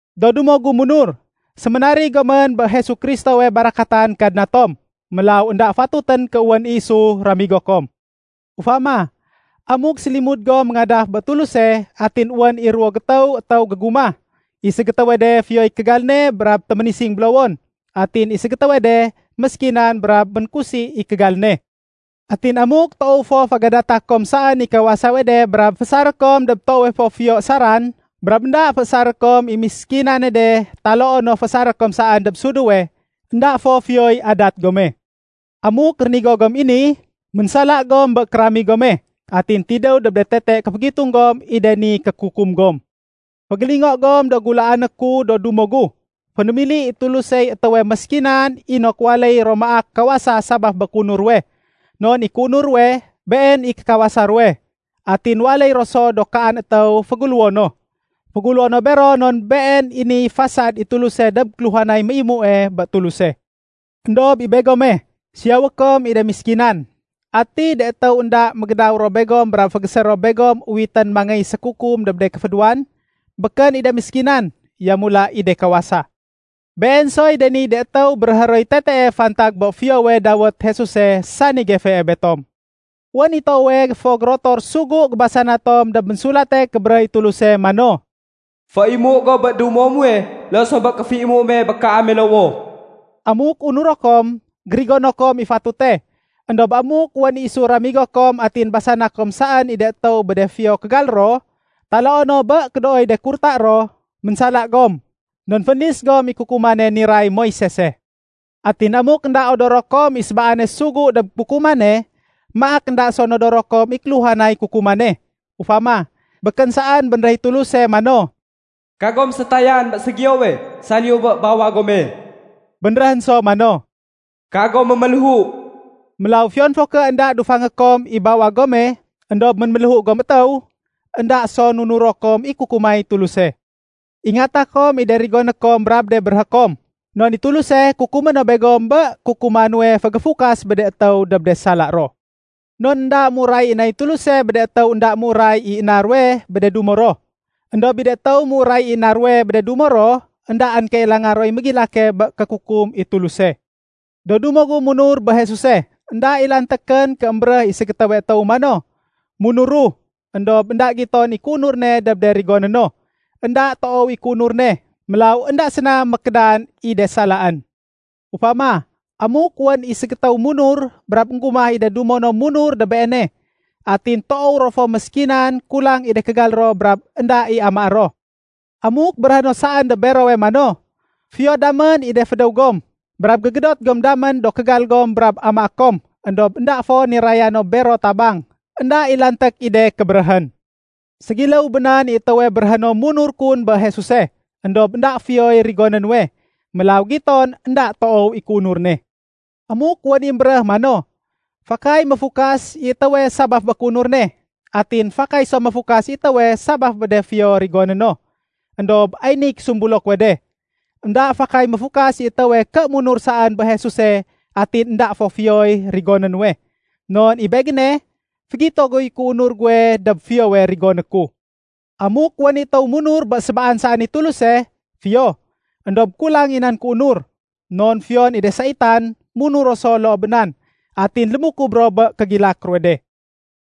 Do dumo gu munur, séménarig gomén bé Jesu Kristowe barakatan Kadna tom. Mélaw énda fatutén ké wén i isu ramigo kom. Ufama, amuk sélimud gom méngadaf bé Tuluse atin wén i ruwo gétéw étéw gégumah. I ségétéwe de fiyoy kégal ne brab téménising bélowon. Atin i ségétéwe de méskinan brab ménkusi i kégal ne. Atin amuk toow fo fégadata kom saén i kawasawe de brab féésaré kom dob toowe fo fiyo ésaran, brab énda féésaré kom i miskinane de taloo no féésaré kom saén dob suduwe, énda fo fiyoy adat gome. Amuk rénigo gom i ni, ménsala gom bé kéramig gome, atin tidéw dob de tete kéfégitung gom i de ni kékukum gom. Fégélingo gom do gulaané ku do dumo gu. Fénémili i Tulusey étéwe méskinan inok waléy ro maak kawasa sabaf bé kéunur ruwe. Non i kéunur ruwe, been i kékawasa ruwe. Atin waléy ro so do kaan étéw féguléwo no. Féguléwo no bero non been i niy fasad i Tuluse dob kéluhanay méimue bé Tuluse. Endob i begome, siyawé kom i de méskinan. Ati de étéw do énda mégédaw ro begom brab fégésé ro begom uwitén mangéy sékukum dob de kéfédéwan? Békén i de méskinan, yamula i de kawasa. Been soy de niy de étéw béréhé roy tetee fantag bé fiyowe dawét Jesuse sani gefee betom. Wén i toowe fo gérotor sugu gébasana tom dob Ménsulate Kébéréh i Tuluse mano, “Féimu go bé dumo muwe loo so bé kéféimu me bé kaame lowoh.” Amuk unuro kom, gérigono kom i fatute. Endob amuk wén i isu ramigo kom atin basana kom saén i de étéw bé de fiyo kégal ro, taloo no bé kédooy de kurta ro, ménsala gom. Non fénlis gom i kukumane niray Moisese. Atin amuk énda odoro kom i sébaane sugu dob kukumane, maak énda so nodoro kom i kéluhanay de kukuman. Ufama, békén saén bénréh i Tuluse mano, “Kagom sétayan bé ségiyowe saliyu bé bawag gome.” Bénréhén so mano, “Kagom méméléhu.” Mélaw fiyon fo ké énda dufangé kom i bawag gome, éndob ménméléhu gom étéw, énda so nunuro kom i kukumay Tuluse. Ingata kom i de rigoné kom brab de béréhé kom, non i Tuluse kukumé no begom bé kukuma nuwe fégéfukas bé de étéw dob de sala ro. Non énda méuray i nay Tuluse bé de étéw énda méuray i na ruwe bé de dumo ro. Endob i de étéw méuray i na ruwe bé de dumo ro, éndaén kailanga roy mégilake bé kékukum i Tuluse. Do dumo gu munur bé Jesuse énda i lantékén ké émbéréh i ségétéwe étéw mano, “Munuru,” éndob énda giton i kéunur ne dob de rigoné no. Enda toow i kéunur ne, mélaw énda séna mékédan i de salaén. Ufama, amuk wén i ségétéw munur, brab énggumah i de dumo no munur dob beene. Atin toow ro fo méskinan, kulang i de kégal ro brab énda i amaé ro. Amuk béréhé no saén dob berowe mano, “Fiyo damén i de fédéw gom. Brab gégédot gom damén do kégal gom brab amaé kom,” éndob énda fo niraya no bero tabang, énda i lanték i de kébéréhén. Ségiléw bé nan i étéwe béréhé no munur kun bé Jesuse, éndob énda fiyoy rigoné nuwe. Mélaw giton i énda toow i kéunur ne. Amuk wén i émbéréh mano, “Fakay méfukas i étéwe sabaf bé kéunur ne. Atin fakay so méfukas i étéwe sabaf bé de fiyo rigoné no.” Endob ay niy késumbulo kuwe de. Enda fakay méfukas i étéwe ké munur saén bé Jesuse atin énda fo fiyoy rigoné nuwe. Non i begéne, fégito guy kéunur guwe dob fiyowe rigoné ku. Amuk wén i étéw munur bé sébaan saén i Tuluse, fiyo, éndob kulang i nan kéunur. Non fiyon i de saitan, munur ro so loo bé nan, atin lémukub ro bé kégilak ruwe de.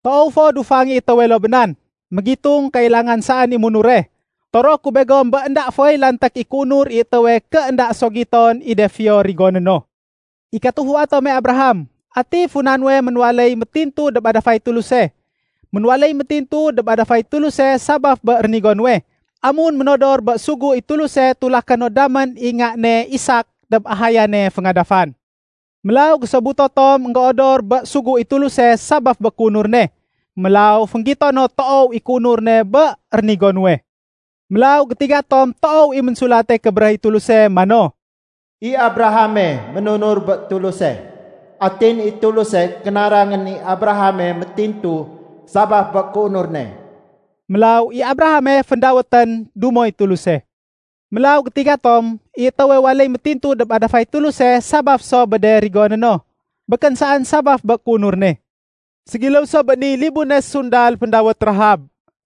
Toow fo dufang i étéwe loo bé nan, mégitung kailangan saén i munure. Toroé ku begom bé énda foy lanték i kéunur i étéwe ké énda so giton i de fiyo rigoné no. I katufua tome Abraham, ati funa nuwe ménwaléy métintu dob adafay Tuluse? Ménwaléy métintu dob adafay Tuluse sabaf bé rénigo nuwe, amun ménodor bé sugu i Tuluse tulaké no damén i nga ne Isak dob ahayane féngadafan. Mélaw gésobuto tom énggéodor bé sugu i Tuluse sabaf bé kéunur ne. Mélaw fénggito no toow i kéunur ne bé rénigo nuwe. Mélaw gétiga tom toow i Ménsulate Kébéréh i Tuluse mano, “I Abrahame ménunur bé Tuluse. Atin i Tuluse kénarangén i Abrahame métintu sabaf bé kéunur ne.” Mélaw i Abrahame féndawétén “Dumoy Tuluse”. Mélaw gétiga tom, i étéwe waléy métintu dob adafay Tuluse sabaf so bé de rigoné no, békén saén sabaf bé kéunur ne. Ségiléw so bé niy libune sundal féndawét Rahab.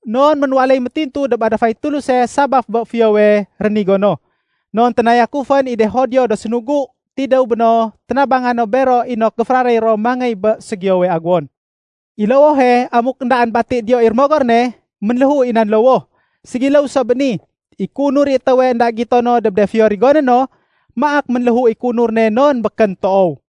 Non ménwaléy métintu dob adafay Tuluse sabaf bé fiyowe rénigo no. Non ténayakufén i de Judio do sénugu, tidéw béno ténabanga no bero inok géféraréy ro mangéy bé ségiyowe aguwon. I lowohe, amuk éndaén bati diyo i rémogor ne, ménléhu i nan lowoh. Ségiléw so bé ni, i kéunur i étéwe énda gitono dob de fiyo rigoné no, maak ménléhu i kéunur ne non békén toow.